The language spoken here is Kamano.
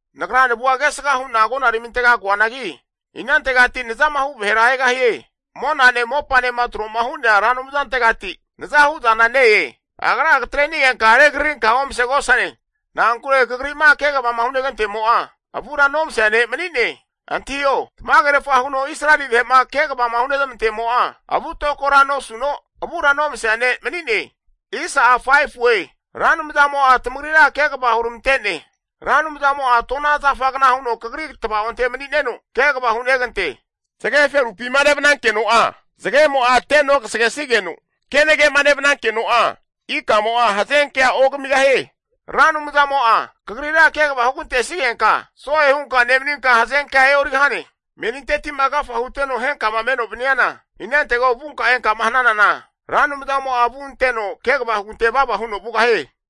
Nagra navua kesga hu'na agonaramintega koanagi, inantegati nazamahu vahera egahie? Monane mopanema tro'ma hu'nea Ra Anumzantegati naza hu'zana ne-e. Agra katre'nigenka regrarinka omasegosane. Na'ankure kagri'ma kegavama hunegantemo'a avura nomasea ne' mani'ne. Antahio, tamagerfa huno Israeli vahe'ma kegavama hunezmantemo'a, avu'tokora nosuno avura nomasea ne' mani'ne. Ra Anumzamo'a tamagrira kegava huramante'ne. Ra Anumzamo'a tona zafagna huno kagri tvaonte mani'neno, kegava hunegante. Zage feru'pima nevnankeno'a zagemo'a tenogasagesigeno, kenage'ma nevnankeno'a, ikamo'a hazenkea ogamigahie. Ra Anumzamo'a kagrira kegava hugante'sigenka, so'e hunka nemaninka hazenkea e'origahane. Meninteti'ma agafa huteno henkama maninoma vaniana, inantego vunka enka'ma hananana Ra Anumzamo'a avua anteno kegava hugante vava huno vugahie.